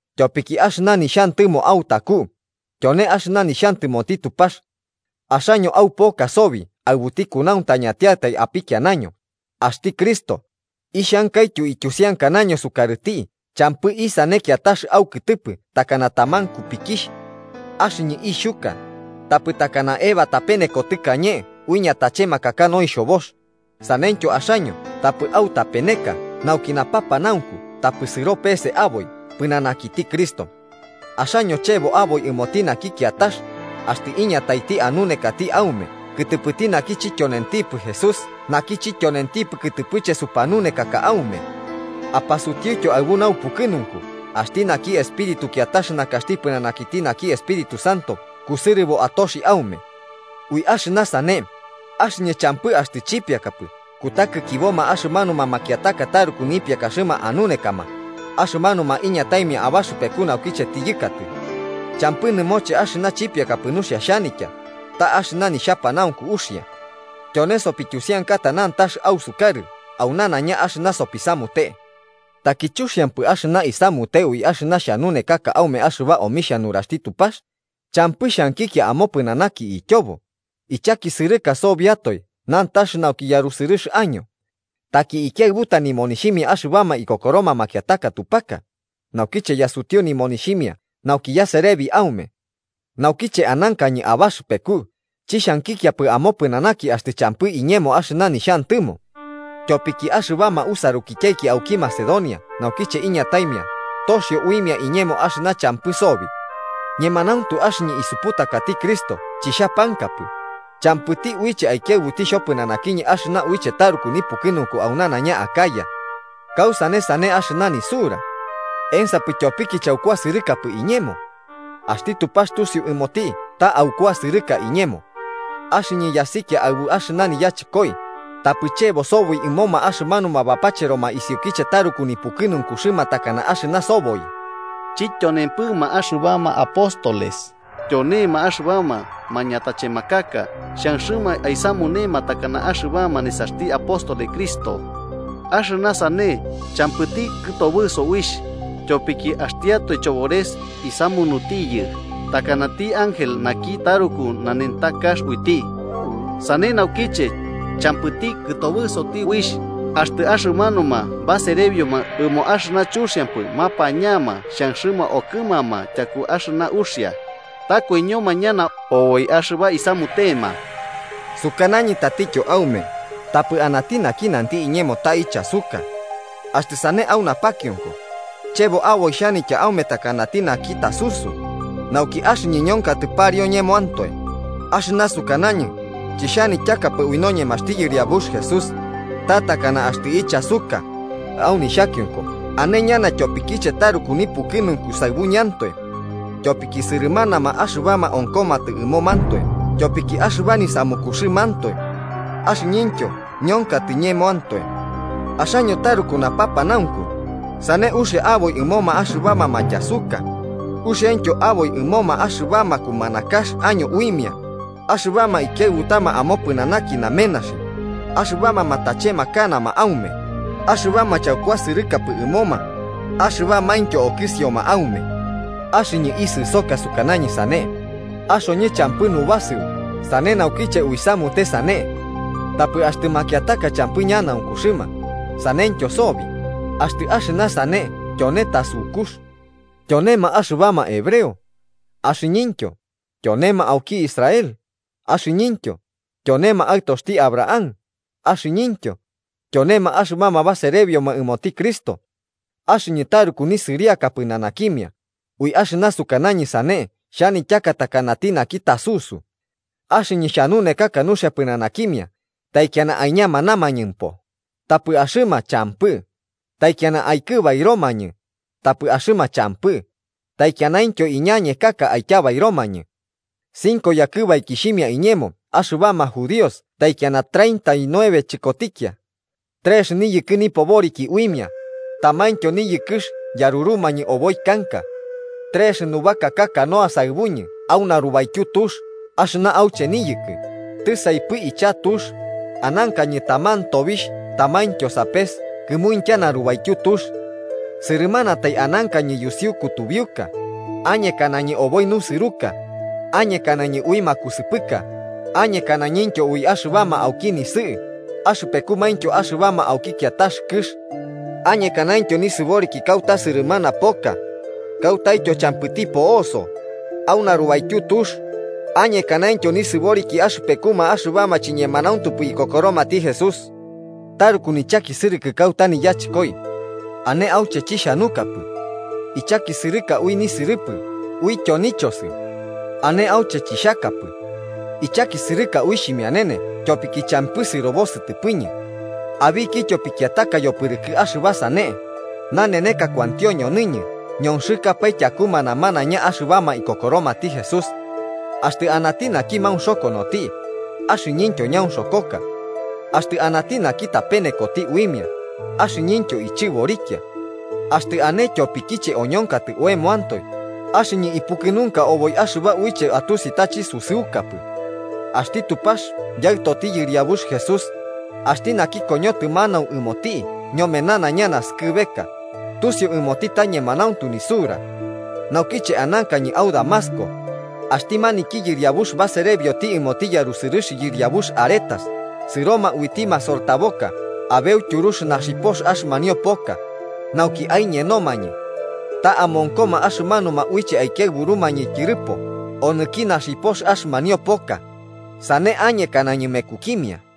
Tyopiki axɨna nixhantɨmo autaku, tyone axɨna nixhantɨmoti Tupax. Axaño aupoka sobi aɨbuti kunauntañantiatai apikianaño, axti Cristo, ixhankaityo ityusiankanaño sukarɨti champɨ isane kiatax aukɨtɨpɨ takana taman kupikixh. Axɨñɨ ixhuka, tapɨ takana Eva tapeneko tɨkañe ui ñatachemakaka noixhobox, saneityo axaño tapɨ autapeneka nauki napapanaunku tapɨ sɨro pese aboi pɨnanakiti Cristo. Axaño chebo aboi ɨmoti naki kiatax axtɨ iñataiti anunekati aume kɨtɨpɨti naki chityonentipɨ Jesús naki chityonentipɨ kɨtɨpɨche supanunekaka aume. Apasutiutyo aɨbu naupukɨnunku axti naki espíritu kiatax nakaxti pɨnanakiti naki Espíritu Santo kusɨrɨbo atoxi aume. Ui axɨna sane, axɨñɨ champɨ axtɨ chipiakapɨ kutakikiboma axɨmanuma makiataka taruku nipiakaxɨma anunekama axɨmanuma iñataimia abaxɨpeku naukiche tiyɨkatɨ. Champɨ nɨmoche axɨna chipiakapɨ nuxia xhanitya, ta axɨna nixhapanaunku uxia. Tyone sopityusiankata nantax ausukarɨ au nanaiña axɨna sopisamute. ¿Taki chuxiampɨ axɨna isamute ui axɨna xhanunekaka aume axɨba omixhia nuraxti Tupax champɨ xhankikia omopɨnanaki ityobo, ichakisɨrɨka sobiatoe nantax nauki yarusɨrɨx año? Taki ikiaɨbuta nimonixhimia axɨbama ikokoroma makiataka tupaka, naukiche yasutiu nimonixhimia nauki yaserebi aume. Naukiche anankañɨ abaxɨpeku chixhankikiapɨ amopɨnanaki axtɨ champɨ iñemo axɨna nixhantɨmo. Tyopiki axɨbama usarukityaiki auki Macedonia naukiche iñataimia toxio uimia iñemo axɨna champɨ sobi. Ñemanauntu axɨñɨ isuputakati Cristo chixhapamkapɨ, champɨti uiche aikiaɨbuti xhopɨnanakiñɨ axɨna uiche taruku nipukɨnunku au nanaiña Acaya. ¿Kausane sane axɨna nisura? ¿Ensapɨ tyopiki chaukuasɨrɨkapɨ iñemo? ¡Axti Tupax tusiu ɨmoti ta aukuasɨrɨka iñemo! Axɨñɨ yasikia aɨbu axɨna niyachɨkoi, tapɨ chebo sobi ɨmoma axɨmanuma bapacheroma isiukiche taruku nipukɨnunkuxɨma takana axɨna soboi. Chityonempɨma axɨbama apóstoles tyonema axɨbama mañatachemakaka xhanxɨma aisamunema takana axɨbama nesaxti apóstoles Cristo. Axɨna sane champɨti kɨtobɨso uixh, tyopiki axtiatoe Chobores isamunutiyɨ takanati ángel naki taruku nanentakax uiti. Sane naukiche, champɨti kɨtobɨsoti uixh axtɨ axɨmanuma baserebioma ɨmo axɨna chuxiampɨ mapañama xhanxɨma okɨmama tyaku axɨna uxia. ¡Ta koiñoma ñana oboi axɨba isamutema! Sukanañɨ tatityo aume tapɨ anati naki nanti iñemo ta ichasuka. Axtɨ sane au napakionko, chebo aboi xhanitya aume takanati naki tasusu, nauki axɨñɨ ñonkatɨ pariu ñemoantoe, axɨna sukanañɨ, chixhanityakapɨ ui noñemaxti Yɨriabux Jesús, ta takana axtɨ ichasuka, au nixhakionko ane ñana tyopikiche taruku nipukɨnunku saɨbuñɨantoe. Tyopiki sɨrɨmanama axɨbama onkomatɨ ɨmomantoe tyopiki axɨba nisamukuxɨmantoe. Axɨñɨntyo ñonkatɨ ñemoantoe. Axaño taruku napapanaunku, sane uxia aboi ɨmoma axɨbama matyasuka, uxiaintyo aboi ɨmoma axɨbama kumanakax año uimia, axɨbama ikiaɨbutama amopɨnanaki namenaxi, axɨbama matachemakanama aume, axɨbama chaukuasɨrɨkapɨ ɨmoma axɨbamaintyo okɨsioma aume. Axɨñɨ isɨsoka sukanañɨ sane, ¡axoñɨ champɨ nubasɨu sane naukiche uisamute sane! Tapɨ axtɨ makiataka champɨ ñanaunkuxɨma, saneityo sobi, axtɨ axɨna sane tyone tasukux. ¿Tyonema axɨbama hebreo? Axɨñɨntyo. ¿Tyonema auki Israel? Axɨñɨntyo. ¿Tyonema aɨtoxti Abraham? Axɨñɨntyo. ¿Tyonema axɨbama baserebioma ɨmoti Cristo? Axɨñɨ taruku nisɨriaka pɨnanakimia, ui axɨna sukanañɨ sane xhanityaka takanati naki tasusu. Axɨñɨ xhanunekaka nuxia pɨnanakimia, taikiana aiñamanamañɨmpo, tapɨ axɨma champɨ, taikiana aikɨbairomañɨ, tapɨ axɨma champɨ, taikianaintyo iñañekaka aityabairomañɨ. Cinco yakɨbaikixhimia iñemo axɨbama judíos taikiana treinta y nueve chɨkotikia. Trex niyɨkɨ nipoboriki uimia, tamaintyo niyɨkɨx yarurumañɨ oboi kanka. Trex nubakaka canoa saɨbuñɨ au narubaityu tux axɨna auche niyɨkɨ, tisaipɨ icha tux, anankañɨ taman tobixh tamaintyo sapes kɨmuintya narubaityu tux. Sɨrɨmanatai anankañɨ yusiu kutubiuka, añekanañɨ oboi nusɨruka, añekanañɨ ui makusɨpɨka, añekanañɨntyo ui axɨbama auki nisɨ'ɨ axɨpekumaintyo axɨbama auki kiatax kɨx. Añekanaintyo nisɨboriki kauta sɨrɨmana poka, kautaityo champɨti po'oso, au narubaityu tux, añekanaintyo nisɨboriki axɨpekuma axɨbama chiñemanauntupɨ ikokoromati Jesús. Taruku nichakisɨrɨkɨ kuata niyachɨkoi. Ane auche chixhanukapɨ. Ichakisɨrɨka ui nisɨrɨpɨ uityo nichosɨ. Ane auche chixhakapɨ. Ichakisɨrɨka ui xhimianene tyopiki champɨ sɨrobo sɨtɨpɨñɨ. Abikityo pikiataka yopɨrɨkɨ axɨba sane, naneneka kuantio ñonɨñɨ ñonxɨkapae tyakuma namanaiña axɨbama ikokoromati Jesús. Axtɨ anati naki maunxokonoti, axɨñɨntyo ñaunxokoka. Axtɨ anati naki tapenekoti uimia, axɨñɨ ichɨborikia. Axtɨ ane tyopikiche oñonkatɨ oemoantoe, axɨñɨ ipukɨnunka oboi axɨba uiche atusi ta chisusɨukapɨ. Axti Tupax Yaɨtoti Yɨriabux Jesús, axti naki koñotɨ manau ɨmoti ñome nanaiña naskɨbeka, tusiu ɨmoti ta ñemanauntu nisura. Naukiche anankañɨ au Damasco, axti maniki yɨriabux baserebioti ɨmoti yarusɨrɨx yɨriabux Aretas sɨroma uiti masortaboka abeu tyurux naxipox axɨmanio poka, nauki aiñenomañɨ. Ta amonkoma axɨmanuma uiche aikiaɨburumañɨ tyɨrɨpo onɨki naxipox axɨmanio poka, sane añekanañɨ mekukimia.